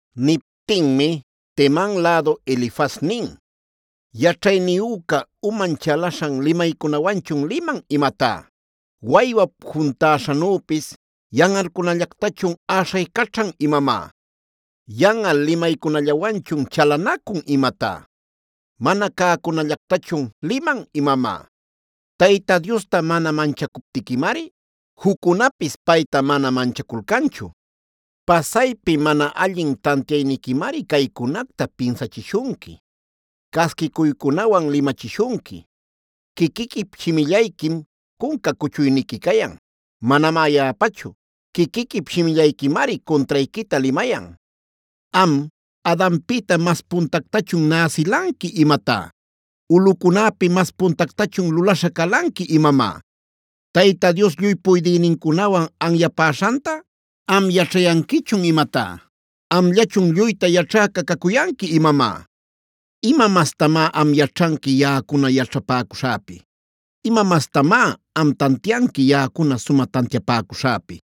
Niptinmi Teman lädu Elifaz nin: “¿Yaćhayniyüca uman chalaśhan limaycunawanchun liman imatá? ¿Waywap juntäśhanüpis yanꞌalcunallactachun äśhaycaćhan imamá? ¿Yanꞌal limaycunallawanchun chalanacun imatá? ¿Mana cäcunallactachun liman imamá? Tayta Diosta mana manchacuptiquimari, juccunapis payta mana manchaculcanchu. Pasaypi mana allin tantiayniquimari caycunacta pinsachishunqui, casquicuycunawan limachishunqui. Quiquiquip shimillayquim cunca cuchuyniqui cayan; manamá yaꞌapachu. Quiquiquip shimillayquimari cuntrayquita limayan. “Am, ¿Adanpïta mas puntactachun näsilanqui imatá? ¿Ulꞌucunäpi mas puntactachun lulaśha calanqui imamá? ¿Tayta Dios lluy puydïnincunawan anyapäśhanta am yaćhayanquichun imatá?a ¿Amllachun lluyta yaćhäca cacuyanqui imamá? ¿Ima mastamá am yaćhanqui yaꞌacuna yaćhapäcuśhäpi? ¿Ima mastamá am tantianqui yaꞌacuna sumä tantiapäcuśhäpi?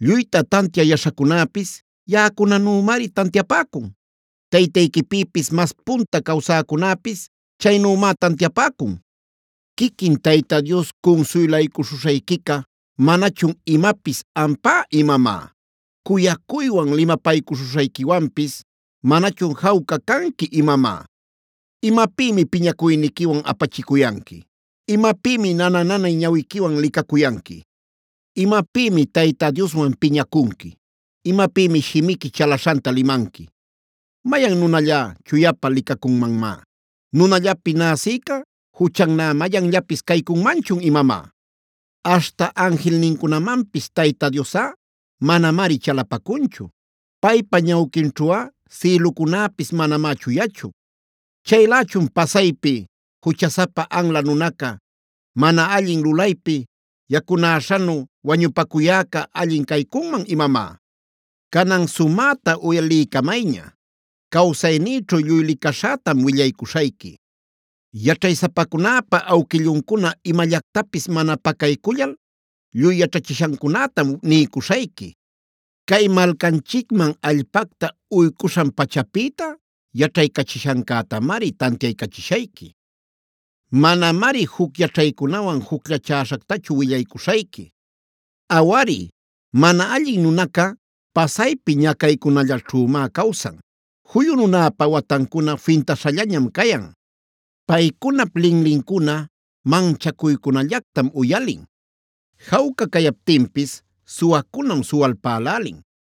Lluyta tantiä yaśhacunäpis yaꞌacunanümari tantiapäcun. Taytayquipïpis mas punta cawsäcunäpis chaynümá tantiapäcun. “¿Quiquin Tayta Dios cunsuylaycuśhuśhayquica, manachun imapis ampá imamá? ¿Cuyacuywan limapaycuśhuśhayquiwanpis manachun jawca canqui imamá? ¿Imapïmi piñacuyniquiwan apachicuyanqui? ¿Imapïmi nana-nanay ñawiquiwan licacuyanqui? ¿Imapïmi Tayta Dioswan piñacunqui? ¿Imapïmi shimiqui chalaśhanta limanqui? ¿Mayan nunallá, chuyapä licacunmanmá? ¿Nunallapi näsïca juchannä mayanllapis caycunmanchun imamá? Aśhta anjilnincunamanpis Tayta Diosꞌa manamari chalapacunchu. Paypa ñawquinćhuꞌa sïlucunäpis manamá chuyachu. Chaylächun pasaypi juchasapa anla nunaca, mana allin lulaypi yacunäśhanu wañupacuyäca, ¿allin caycunman imamá? “Canan sumäta uyaliycamayña; cawsaynïćhu lluy licaśhätam willaycuśhayqui. Yaćhaysapacunäpä awquilluncuna imallactapis mana pacaycullal lluy yaćhachishancunätam niycuśhayqui. Cay malcanchicman allpacta uycuśhan-pachapïta yaćhaycachishancätamari tantiaycachishayqui; manamari juc yaćhaycunawan jucllachäśhactachu willaycuśhayqui. “Awari, mana allin nunaca pasaypi ñacaycunallaćhümá cawsan. Juyu nunäpa watancuna fintaśhallañam cayan. Paycunap linlincuna manchacuycunallactam uyalin; jawca cayaptinpis suwacunam suwalpälälin.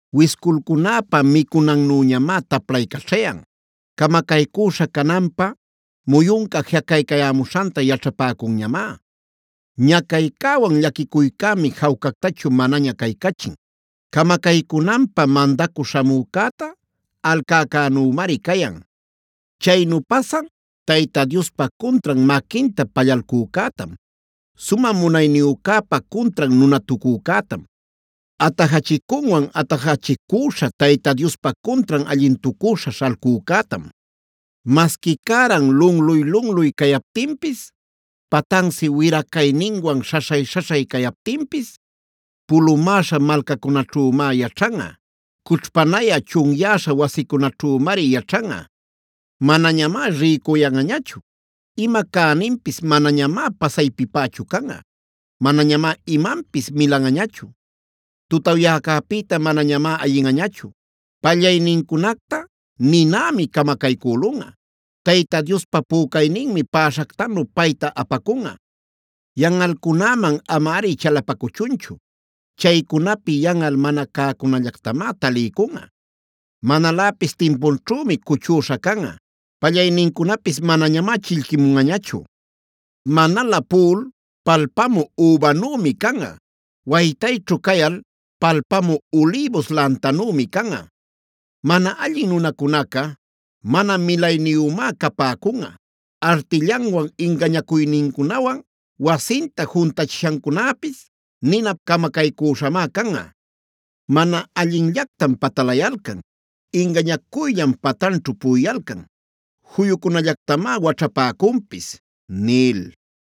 Wisculcunäpä micunannüñamá taplaycaćhayan. Camacaycüśha cananpä muyunca jiꞌacaycayämuśhanta yaćhapäcunñamá. Ñacaycäwan llaquicuycämi jawcactachu manaña caycachin. Camacaycunanpä mandacü śhamücäta alcäcänümari cayan. Chaynu pasan Tayta Diospa cuntran maquinta pallalcücätam, sumä munayniyücäpa cuntran nunatucücätam, atajachicunwan atajachicüśha Tayta Diospa cuntran allintucüśha śhalcücätam. “Masqui cäran lunluy-lunluy cayaptinpis, patansi wira-cayninwan śhaśhay-śhaśhay cayaptinpis, pulumäśha malcacunaćhümá yaćhanꞌa, cućhpanayä chunyäśha wasicunaćhümari yaćhanꞌa. Manañamá rïcuyanꞌañachu; ima cäninpis manañamá pasaypipächu canꞌa, manañamá imanpis milanꞌañachu. Tutawyaycäpïta manañamá ayinꞌañachu, pallaynincunacta ninämi camacaycülunꞌa, Tayta Diospa pücayninmi päśhactanu payta apacunꞌa. Yanꞌalcunäman amari chalapacuchunchu. Chaycunapi yanꞌal mana cäcunallactamá taliycunꞌa. Manaläpis timpunćhümi cuchüśha canꞌa. Pallaynincunapis manañamá chillquimunꞌañachu. Manalä puꞌul palpamü übanümi canꞌa. Waytayćhu cayal palpamü ulïbus lantanümi canꞌa. Mana allin nunacunaca mana milayniyümá capäcunꞌa. Artillanwan ingañacuynincunawan wasinta juntachishancunäpis ninap camacaycüśhamá canꞌa. Mana allinllactam patalayalcan, ingañacuyllam patanćhu puꞌuyalcan, juyucunallactamá waćhapäcunpis” nil.